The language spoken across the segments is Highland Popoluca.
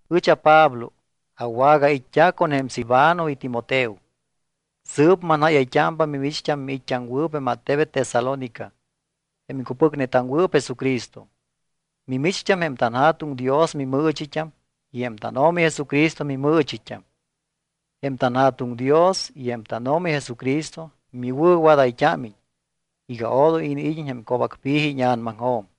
Ɨch aPablo. Awagait́t́a con jém Silvano y Timoteo. Sɨɨp manjáyayt́ámpa mimicht́am miit́t́aŋwɨɨp jém attebet Tesalónica, jém iŋcupɨcnetaŋwɨɨp Jesucristo. Mimicht́am jém tanJa̱tuŋ Dios mimɨɨchit́am y jém tánO̱mi Jesucristo mimɨɨchit́am. Jém tanJa̱tuŋ Dios y jém tánO̱mi Jesucristo miwɨ̱wadayt́ámiñ iga odoy iniid́iñ jém co̱bacpi̱ji íña̱namajo̱m.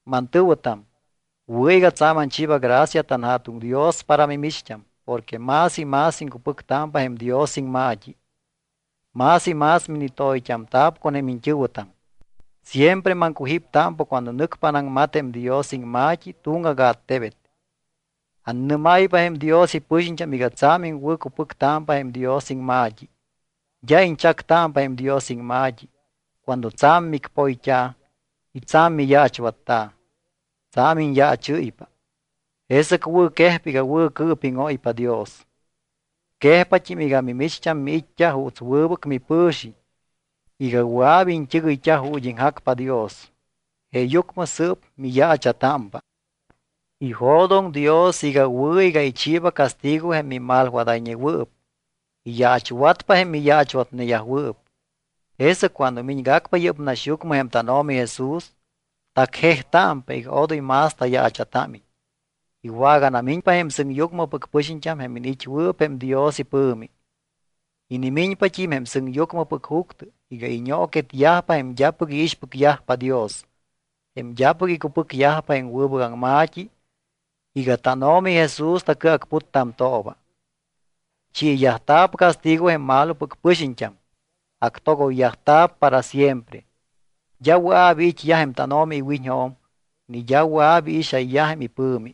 Mantɨ̱wɨtam, wɨ̱ iga tsa̱m anchiiba gracia tanJa̱tuŋ Dios para mimicht́am porque más y más iŋcupɨctámpa jém Dios iŋma̱t́i, más y más minitoyt́amta̱p con jém iñt́ɨ̱wɨtam. Siempre maŋcujíptámpa cuando nɨcpa anaŋmat jém Dios iŋma̱t́i tuŋgac attebet. Annɨ́máypa jém Dios ipɨxiñt́am iga tsa̱m iŋwɨ̱cupɨctámpa jém Dios iŋma̱t́i. D́a iñchactámpa jém Dios iŋma̱t́i cuando tsa̱m micpóyt́a̱ y tsa̱m miyaachwatta̱. Tsa̱m iñyaachɨ́ypa. Jesɨc wɨ̱quejpa iga wɨ̱cɨɨpíŋóypa Dios. Quejpat́im iga mimicht́am miit́t́a juuts wɨbɨc mipɨ̱xiñ iga wɨa̱p iñt́ɨgɨyt́a ju̱t́ iŋjacpa Dios. Jeeyucmɨ sɨɨp miyaacha̱támpa. Ijo̱doŋ Dios iga wɨ̱ iga ichiiba castigo jém mimalwadayñewɨɨp. Iyaachwatpa jém miyaachwatneyajwɨɨp. Jesɨc cuando miñgacpa yɨ́p naxyucmɨ jém tánO̱mi Jesús, tacjejtámpa iga odoy más tayaacha̱támiñ. Iwaganamiñpa jém sɨŋyucmɨpɨc pɨxiñt́am jém iniit́wɨɨp jém Dios ipɨ̱mi. Inimiñpat́im jém sɨŋyucmɨpɨc juctɨ iga iñooquetyajpa jém d́apɨc iixpɨcyajpa Dios, jém d́apɨc icupɨcyajpa jém wɨbɨc aŋma̱t́i iga tánO̱mi Jesús tacɨacputtamtooba. Chiiyajta̱p castigo jém malopɨc pɨxiñt́am, actogoyyajta̱p para siempre. D́a wɨa̱p iit́yaj jém tánO̱mi iwiñjo̱m ni d́a wɨa̱p iixayyaj jém ipɨ̱mi.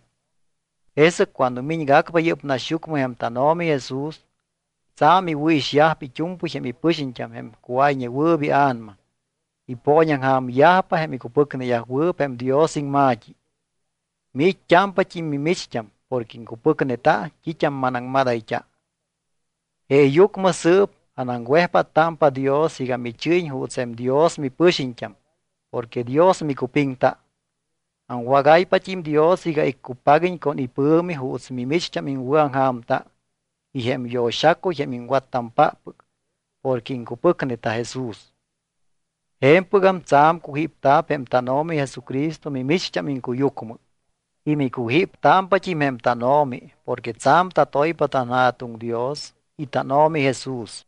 Jesɨc cuando miñgacpa yɨ́p naxyucmɨ jém tánO̱mi Jesús, tsa̱m iwɨ̱ixyajpa it́u̱mpɨy jém ipɨxiñt́am jém cuáyñewɨɨp ia̱nama, ipooñaŋja̱myajpa jém icupɨcneyajwɨɨp jém Dios iŋma̱t́i. Miit́t́ámpat́im mimicht́am porque iŋcupɨcneta t́it́am manaŋmadayt́a. Jeeyucmɨ sɨɨp anaŋwejpáttámpa Dios iga michɨ́yiñ juuts jém Dios mipɨxiñt́am porque Dios micupiŋta. Aŋwagáypat́im Dios iga iccupaguiñ con ipɨ̱mi juuts mimicht́am iŋwɨ̱aŋja̱mta y jém yo̱xacuy jém iŋwattampáppɨc porque iŋcupɨcneta Jesús. Je̱mpɨgam tsa̱m cujípta̱p jém tánO̱mi Jesucristo mimicht́am iŋcuyucmɨ, y micujíptámpat́im jém tánO̱mi porque tsa̱m tatoypa tanJa̱tuŋ Dios y tánO̱mi Jesús.